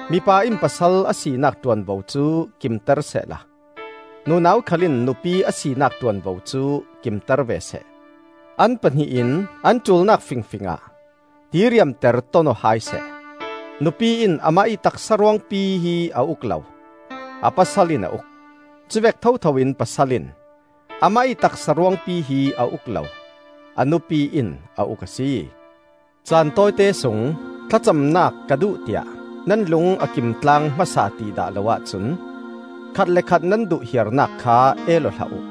Mipa in pasal a sinak ṭuanvo cu kimter sehla nunau khal in nupi a sinak ṭuanvo cu kimter ve seh; an pahnih in an ṭulnak fingfingah diriamter ton-aw hai seh. Nupi in amah ih taksa ruangpi hi a uk lo, a pasal in a uk; cuvek thothoin pasal in amah ih taksa ruangpi hi a uk lo, a nupi in a uk a si. Caan tawite sung thlacamnak ka duh tiah nan lung a kim tlaang hmasa ti dah lo ahcun khat le khat nan duh hiarnak kha el aw hlah uh.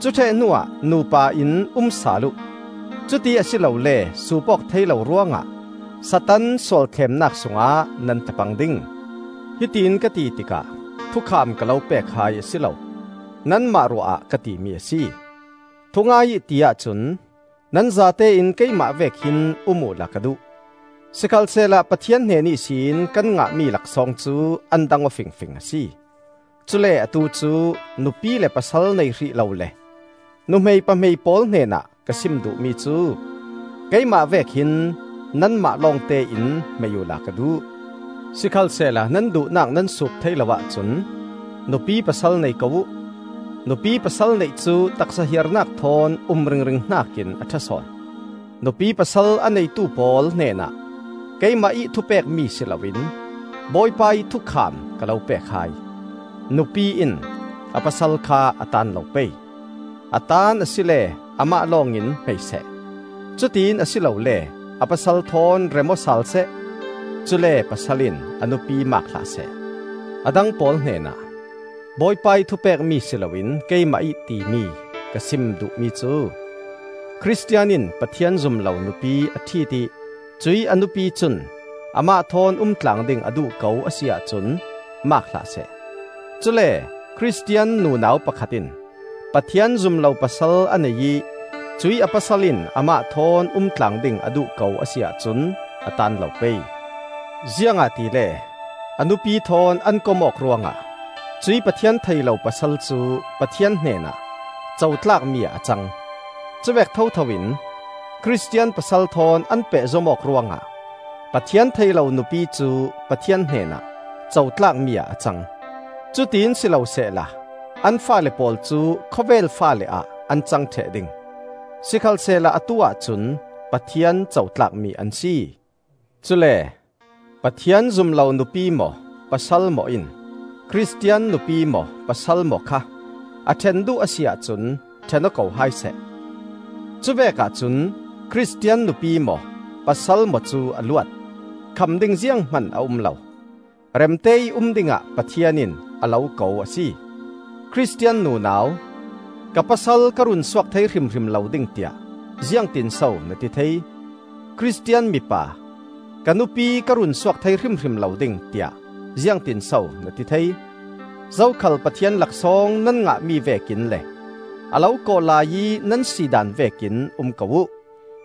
Cu ṭheh hnuah nupa in um sal uh. Cuti a si lole suup awk thei lo ruangah Satan sual thlemnak sungah nan tla pang ding. Hitiin ka ti tikah thukham ka lo pek hai a si lo, nanmah ruah ah ka timi a si. Thungai ih ti ahcun nan zatein keimah vek hin um uhla ka duh; sikhalsehla Pathian hnen ihsin kan ngahmi laksawng cu an dang aw fingfing a si. Cule atu cu nupi le pasal nei hrih lo le nuhmei pahmei pawl hnenah ka sim duhmi cu: keimah vek hin nanmah lawngte in hmei uhla ka duh. Sikhalsehla nan duhnak nan suup thei lo ahcun nupi pasal nei ko uh: nupi pasal neih cu taksa hiarnak thawn um ringring hnakin a ṭha sawn. Nupi pasal a neitu pawl hnenah keimah ih thupekmi si loin Bawipa ih thukham ka lo pek hai: nupi in a pasal kha a taan lo pei. A taan asile amah lawngin hmei seh; cutiin a si lole a pasal thawn rem-aw sal seh. Cule pasal in a nupi maak hlah seh. A dang pawl hnenah (Bawipa ih thupekmi si loin keimah ih timi) ka sim duhmi cu: Khristian in Pathian zum lo nupi a ṭhit ih cuih a nupi cun amah thawn umtlang ding a duh ko a si ahcun maak hlah seh. Cule Khristian nunau pakhat in Pathian zum lo pasal a nei ih cuih a pasal in amah thawn umtlang ding a duh ko a si ahcun a taan lo pei. Ziangahtile a nupi thawn an kom awk ruangah cuih Pathian thei lo pasal cu Pathian hnenah cotlakmi ah a cang; cuvek thotho in Khristian pasal thawn an pehzom awk ruangah Pathian thei lo nupi cu Pathian hnenah cotlakmi ah a cang. Cutiin si lo sehla an faale pawl cu khawvel faale ah an cang ṭheh ding; sikhalsehla atu-ah cun Pathian cotlakmi an si. Cule Pathian zum lo nupi maw pasal maw in Khristian nupi maw pasal maw kha a ṭhen duh a si ahcun ṭhen-aw ko hai seh. Cuvek ahcun Khristian nupi maw pasal maw cu a luat, kham ding zianghman a um lo. Remte ih um dingah Pathian in a lo ko a si. Khristian nunau, ka pasal ka runsuak thei hrimhrim lo ding tiah ziangtinso na ti thei? Khristian mipa, ka nupi ka runsuak thei hrimhrim lo ding, tiah ziangtinso na ti thei? Zokhal Pathian laksawng nan ngahmi vekin le a lo kawh laiih nan sidaan vekin um ko uh.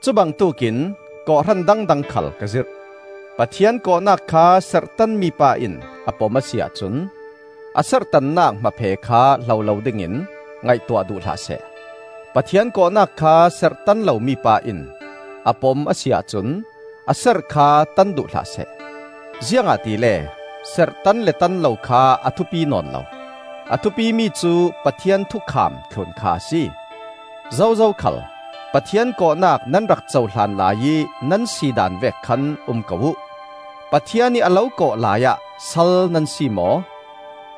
Cubangtuk in kawhhran dangdang khal ka zirh. Pathian kawhnak kha serhtanmi pa in a pom a si ahcun a serhtannak hmaphe kha hlo dingin ngaihtuah duh hlah seh. Pathian kawhnak kha serhtan lomi pa in a pom a si ahcun a serh kha tan duh hlah seh. Ziangahtile serhtan le tan lo kha a thupi nawn lo; a thupimi cu Pathian thukham thlun kha a si. Zozo khal Pathian kawhnak nan rak cohlan laiih nan sidaan vek khan um ko uh. Pathian ih a lo kawh laiah sal nan si maw?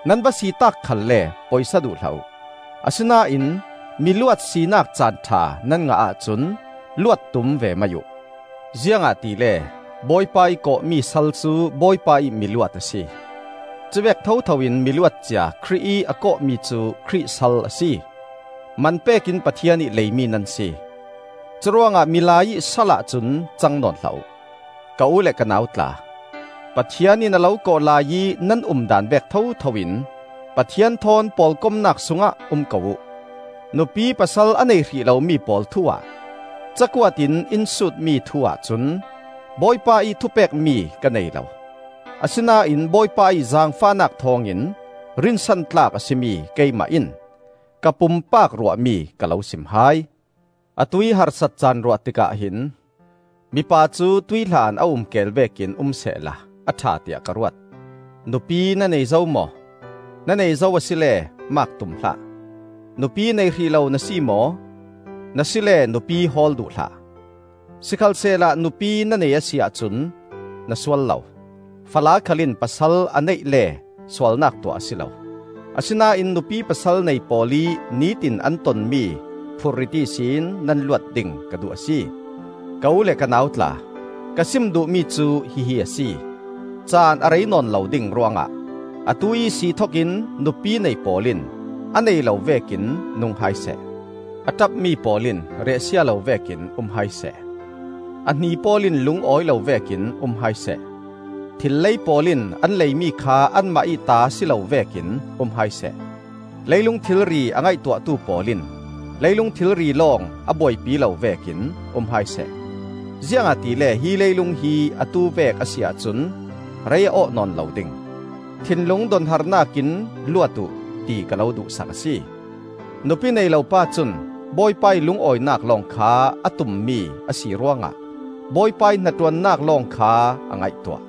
Nan va si taak khalle poisa duh hlah uh! Asinain miluat sinak caan ṭha nan ngah ahcun luat tum ve mai uh! Ziangahtile Bawipa ih kawhmi sal cu Bawipa ih miluat a si. Cuvek thotho in miluat cia Khrih ih a kawhmi cu Khrih sal a si. Man pekin Pathian ih leimi nan si; curuangah milai ih salah cun cang nawn hlah uh. Ka u le ka nau tla, Pathian in a lo kawh laiih nan umdaan vek thotho in Pathian thawn pawlkomnak sungah um ko uh. Nupi pasal a nei hrih lomi pawl thu-ah cakuat in in sutmi thu-ah cun Bawipa ih thupekmi ka nei lo; asinain Bawipa ih zaangfahnak thawngin rinsantlak a si mi keimah in ka pumpak ruahmi ka lo sim hai. Atuih harsat caan ruah tikah hin mipa cu tuihhlan a um keel vekin um sehla a ṭha tiah ka ruat. Nupi na nei zo maw? Na nei zo asile maak tum hlah. Nupi nei hrih lo na si maw? Na si le nupi hawl duh hlah. Sikhalsehla nupi na nei a si ahcun na sual lo; fala khal in pasal a neih le sualnak tuah a si lo. Asinain nupi pasal nei pawl ih nitin an ton mi phurrit ihsin nan luat ding ka duh a si. Ka u le ka nau tla, ka sim duhmi cu hihi a si: caan a rei nawn lo ding ruangah atu ihsi thokin nupi nei pawl in a nei lo vekin nung hai seh; a ṭapmi pawl in riahsia lo vekin um hai seh; a hni pawl in lungawi lo vekin um hai seh; thil lei pawl in an leimi kha anmah ih ta si lo vekin um hai seh; leilung thilri a ngaihtuahtu pawl in leilung thilri lawng a buaipi lo vekin um hai seh. Ziangahtile hi leilung hi atu vek a si ahcun rei a awh nawn lo ding. Thinlung donharnak in luat uh ti ka lo duhsak a si. Nupi nei lo pa cun Bawipa ih lungawinak lawng kha a tummi a si ruangah Bawipa ih hnaṭuannak lawng kha a ngaihtuah.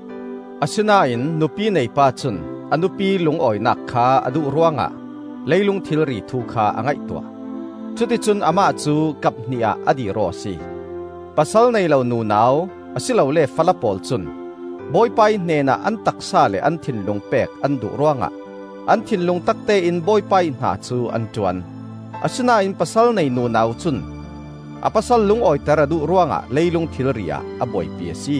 Asinain nupi nei pa cun a nupi lungawinak kha a duh ruangah leilung thilri thu kha a ngaihtuah; cuticun amah cu kap hnih ah a dir-aw a si. Pasal nei lo nunau, a si lole fala pawl cun Bawipa ih hnenah an taksa le an thinlung pek an duh ruangah an thinlung taktein Bawipa ih hna cu an ṭuan; asinain pasal nei nunau cun a pasal lungawiter a duh ruangah leilung thilri ah a buaipi a si.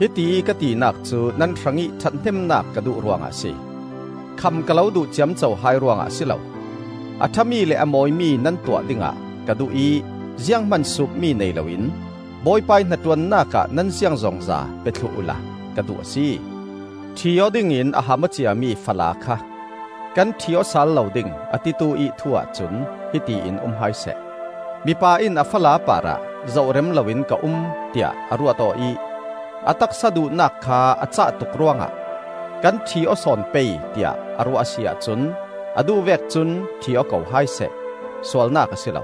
Hitiih ka tinak cu nan hrangih ṭhathnemnak ka duh ruangah a si. Kham ka lo duh ciamco hai ruangah a si lo. A ṭhami le a mawimi nan tuah dingah ka duh ih zianghman suupmi nei loin Bawipa ih hnaṭuannak ah nan ziangzongza pe thluh uhla ka duh a si. Ṭhi aw dingin a ham aw ciami fala kha kan ṭhi aw sal lo ding, a titu-ih thu ahcun hiti in um hai seh: mipa in a fala parah zoh rem loin ka um, tiah a ruat aw ih a taksa duhnak kha a cah tuk ruangah kan ṭhi aw sawn pei tiah a ruah a si ahcun a duh vek cun ṭhi-aw ko hai seh. Sualnak a si lo.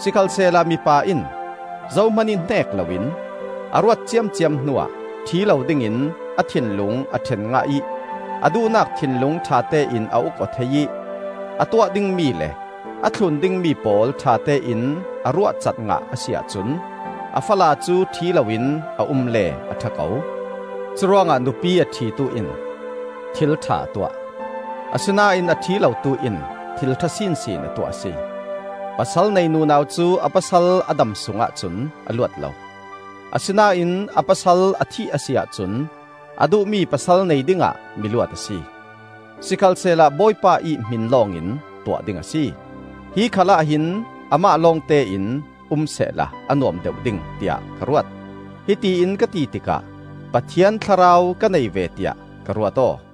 Sikhalsehla mipa in zohmanih hneek loin, a ruat ciamciam hnuah ṭhi lo dingin a thinlung a ṭhen ngah ih a duhnak thinlung ṭhatein a uk aw thei ih a tuah dingmi le a thlun dingmi pawl ṭhatein a ruahcat ngah a si ahcun a fala cu ṭhi loin a um le a ṭha ko. Curuangah nupi a ṭhitu in thil ṭha a tuah; asinain a ṭhi lotu in thil ṭha sinsin a tuah a si. Pasal nei nunau cu a pasal a dam sungah cun a luat lo. Asinain a pasal a thih a si ahcun a duhmi pasal nei dingah miluat a si; sikhalsehla Bawipa ih hmin lawngin tuah ding a si. Hi khal ahhin amah lawngte in um sehla a nuam deuh ding tiah ka ruat; hiti in ka ti tikah Pathian Thlarau ka nei ve tiah ka ruat aw.